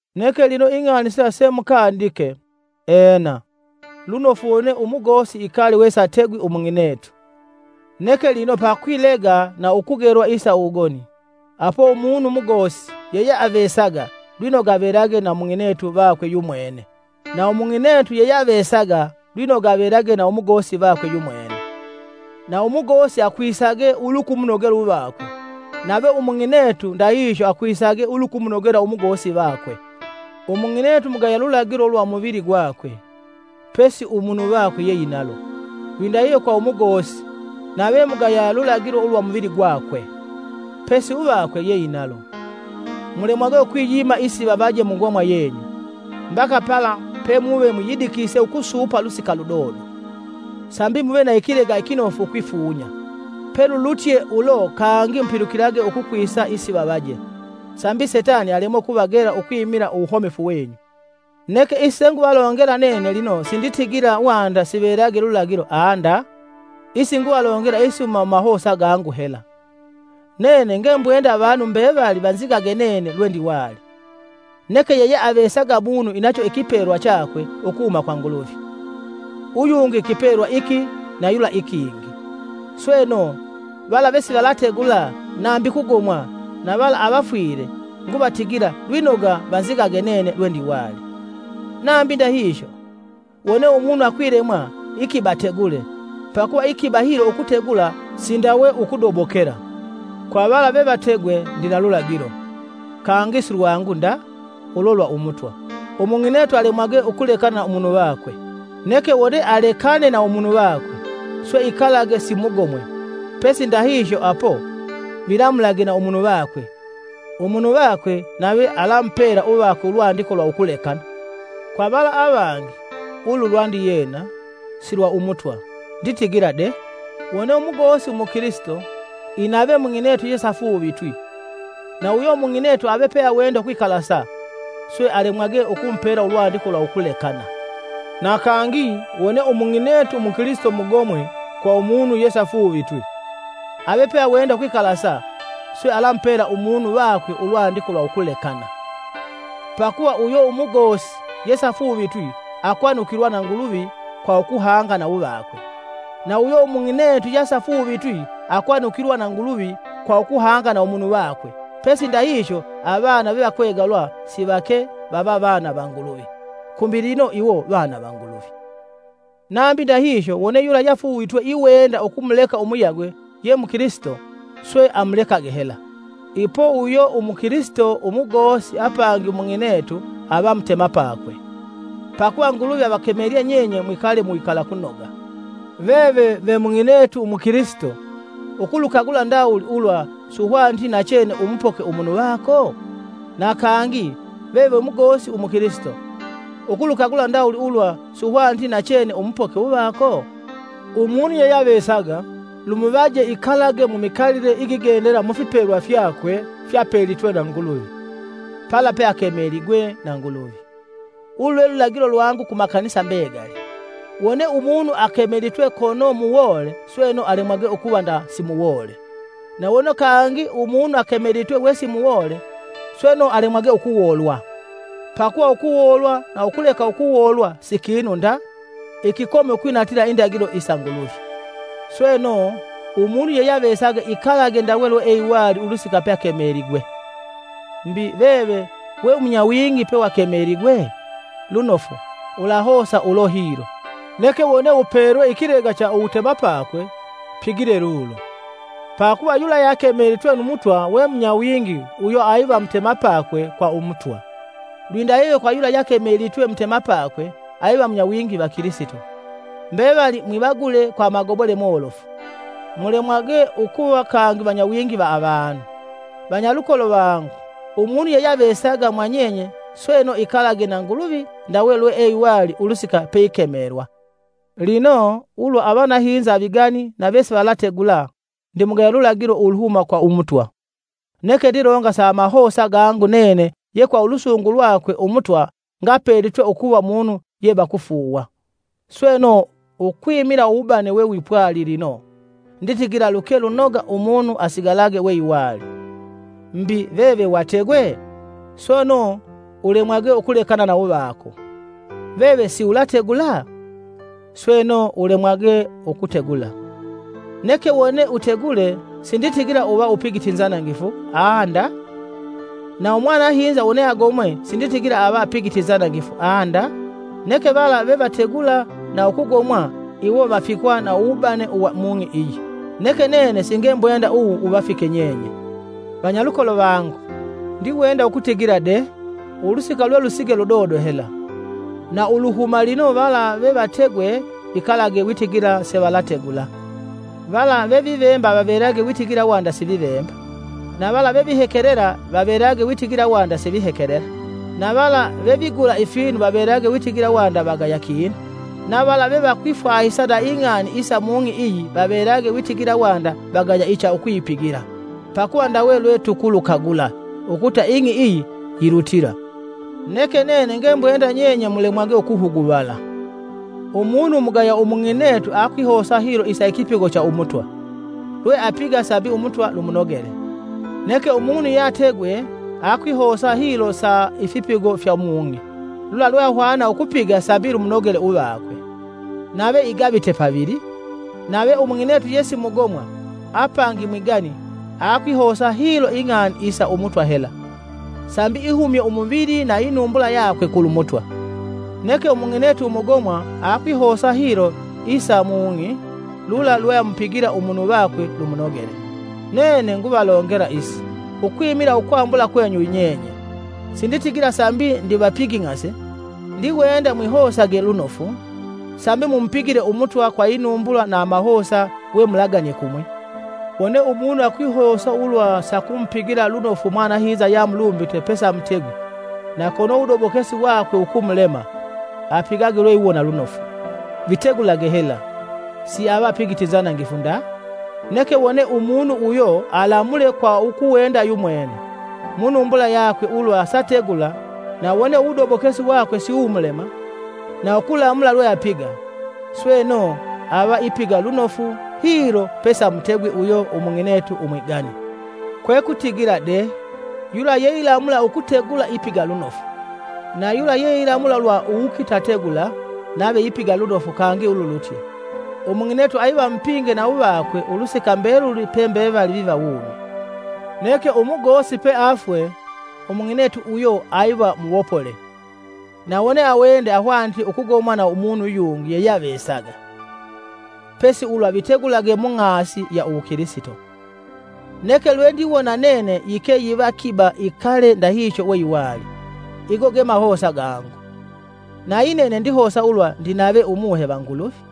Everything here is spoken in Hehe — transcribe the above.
Neke lino ing'ani sila semukandike: Ena, lunofu wone umugosi ikale wesategwi umung'inetu, neke lino pakwilega na ukugelwa isa uwugoni, apo umunu mugosi yeyeavesaga lwinoga avelage na umung'inetu vakwe yumwene, na umung'inetu yeyeavesaga lwinoga avelage na umugosi vakwe yumwene. Na umugosi akwisage ulukumunogela uvakwe, nave umung'inetu ndahihyo akwisage ulukumunogela umugosi vakwe. Umung'inetu mugaya lulagilo ulwa umuvili gwakwe, pesi umunu vakwe yeinalo, lwindahihyo kwa umugosi, nave mugaya lulagilo ulwa umuvili gakwe, pesi uvakwe yeinalo. Mulemwage ukwiyima isivavaje mungomwa yenyu, mbaka pala pemuve mwiyidikise ukusuupa lusika ludodo, sambi muve na ikilega ikinofu ukwifunya. Pelulutye ulo kangi mupilukilage ukukwisa isivavaje, sambi setani alemwe ukuvagela ukwimila uwuhomefu wenyu. Neke isi senguvalongela nene lino sinditigila wanda sivelage lulagilo aa nda, isi nguvalongela isihuma mumahosa gangu hela. Nene ngembwenda avanu mbevali vanzigage nene lwendiwali, neke yeyeavesaga munu inacho ikipelwa chakwe ukuhuma kwa Nguluvi, uyungi ikipelwa iki na yula ikingi. Sweno, vala vesivalategula nambi kugomwa na vala avafwile nguvatigila lwinoga vanzigage nene lwendiwali. Nambi ndahihyo, wone umunu akwilemwa, ikiba ategule, pakuva ikiba hilo ukutegula sindawe ukudobokela. Kwavala vevategwe ndina lulagilo, kangi silwangu nda, ulo lwa Umutwa: umung'inetu alemwage ukulekana na umunu vakwe. Neke wone alekane na umunu vakwe, swe ikalage simugomwe; pesi ndahihyo apo, vilamulage na umunu vakwe. Umunu vakwe nave alamupela uvakwe ulwandiko lwa ukulekana. Kwa vala avangi, (ulu lwandiyena, si lwa Umutwa) nditigila de: Wone umugosi umukilisito inave umung'inetu yesiafuuvitwi, na uyo umung'inetu ave peawenda ukwikalasa, swe alemwage ukumupela ulwandiko lwa ukulekana. Na kangi, wone umung'inetu umukilisito mugomwe kwa umunu yesiafuuvitwi, ave peawenda ukwikalasa, swe alamupela umunu vakwe ulwandiko lwa ukulekana. Pakuva uyo umugosi yesiafuuvitwi akwanukilwa na Nguluvi kwa ukuhanga na uvakwe, na uyo umung'inetu yesiafuuvitwi akwanukilwa na Nguluvi kwa ukuhanga na umunu vakwe pesi ndahihyo avana vevakwegalwa sivake, vava vana va Nguluvi, kumbi lino iwo vana va Nguluvi. Nambi ndahihyo, wone yula yesiafuuvitwi iwenda ukumuleka umuyagwe ye mukilisito, swe, amulekage hela. Ipo uyo umukilisito umugosi apangi umung'inetu, ava mutemapakwe. Pakuva Nguluvi avakemelye nyenye mwikale mu wikalakunoga. Veve we mung'inetu umukilisito, ukulukagula ndawuli ulwa suhwaniti nachene umupoke umunu vako? Na kangi, veve ve mugosi umukilisito, ukulukagula ndawuli ulwa suhwaniti nachene umupoke uvako? Umunu yeyeavesaga lumunoje ikalage mumikalile igigendela mufipelwa fyakwe fyapelitwe na Nguluvi, pala peakemeligwe na Nguluvi. Ulu lwe lulagilo lwangu ku makanisa mbegali. Wone umunu akemelitwe kono muwoole sweno alemwage ukuva nda simuwoole, na wone kangi umunu akemelitwe wesi muwoole, sweno alemwage ukuwoolwa. Pakuva ukuwoolwa na ukuleka ukuwoolwa si kinu nda, ikikomi ukwinatila indagilo isa Nguluvi. Sweno, umunu yeyeavesaga ikalage ndawe lweeiwali ulusika pakemeligwe. Mbi, veve wewimunyawingi pewakemeligwe? Lunofu, ulahosa ulo hilo, neke wone upelwe ikilega cha uwutemapakwe, pigile lulo. Pakuva yula yakemelitwe nu Mutwa we munyawingi uyo aiva mutemapako kwa Umutwa, lwindahihyo kwa yula yakemelitwe mutemapakwe, aiva munyawingi va Kilisito. Mbevali mwivagule kwa amagobole molofu, mulemwage ukuva kangi vanyawingi va avanu. Vanyalukolo vangu, umunu yeyeavesaga mwanyenye sweno ikalage na Nguluvi ndawe lweeiwali ulusika peikemelwa. Lino, ulwa avanahinza avigani na vesivalategula, ndimugaya lulagilo uluhuma kwa Umutwa, neke ndilonga sa amahosa gangu nene ye kwa ulusungu lwakwe Umutwa ngapelitwe ukuva munu ye vakufuuwa. Sweno, ukwimila uwubane wewipwali lino, nditigila luke lunoga umunu asigalage weiwali. Mbi, veve wategwe? Sweno, ulemwage ukulekana na uvako. Veve siulategula? Sweno, ulemwage ukutegula. Neke wone utegule sinditigila uva upigite inzanangifu aa nda, na umwanahinza wone agomwe sinditigila ava apigite inzanangifu aa nda. Neke vala vevategula na ukugomwa iwo vafikwa na uwubane uwa mung'i iyi, neke nene singembwenda uwu wuvafike nyenye. Vanyalukolo vangu, ndiwenda ukutigila de: ulusika lwelusige ludodo hela. Na uluhuma lino vala vevategwe vikalage witigila sivalategula; vala vevivemba vavelage witigila wanda sivivemba, na vala vevihekelela vavelage witigila wanda sivihekelela; na vala vevigula ifinu vavelage witigila wanda vagaya kinu, nawo vala vevakwifwahisa na ing'ani isa mung'i iyi vavelage witigila wanda vagaya icha ukuyipigila. Pakuva ndawe lwetukulukagula, ukuta ing'i iyi, yilutila. Neke nene ngembwenda nyenye mulemwage ukuhuguvala. Umunu umugaya umung'inetu akwihosa hilo isa ikipigo cha umutwa, lweapiga sambi Umutwa lumunogele. Neke umunu yeategwe, akwihosa hilo sa ifipigo fya mung'i, lula lweahwana ukupiga sambi lumunogele uvakwe, nave igavite pavili. Nave umung'inetu yesimugomwa, apangi mwigani, akwihosa hilo ing'ani isa Umutwa hela, sambi ihumye umuvili na inumbula yakwe kulu Mutwa. Neke umung'inetu umugomwa akwihosa hilo isa mung'i lula lweamupigila umunu vakwe lumunogele. Nene nguvalongela isi ukwimila ukwambula kwenyu nyenye, sinditigila sambi ndivapinging'ase. Ndiwenda mwihosage lunofu, sambi mumupigile Umutwa kwa inumbula na amahosa we mulaganie kumwi. Wone umunu akwihosa ulwa sakumupigila lunofu umwanahinza yeamulumbite pesamutegwi, na kono uwudobokesi wakwe wukumulema, apigage lweiwona lunofu; vitegulage hela, siava apigite inzanangifu nda. Neke wone umunu uyo alamule kwa ukuwenda yumwene mu numbula yakwe ulwa sategula na wone uwudobokesi wakwe siwumulema na ukulamula lweapiga, sweno, ava ipiga lunofu hilo pesamutegwi uyo umung'inetu umwigani. Kwekutigila de: yula yeilamula ukutegula ipiga lunofu, na yula yeilamula lwa uwukitategula nave ipiga lunofu kangi ululutye. Umung'inetu aiva mupinge na uvakwe ulusika mbeluli pembevali viva wumi. Neke umugosi peafwe, umung'inetu uyo aiva muwopole, na wone awende ahwanite ukugomwa na umunu yungi yeyeavesaga, pesi ulwa vitegulage mung'asi ya uwukilisito. Neke lwendiwona nene yike yiva ikiba ikale ndahihyo weiwali. Igo ge mahosa gangu, nayi nene ndihosa ulwa ndinave Umuhe va Nguluvi.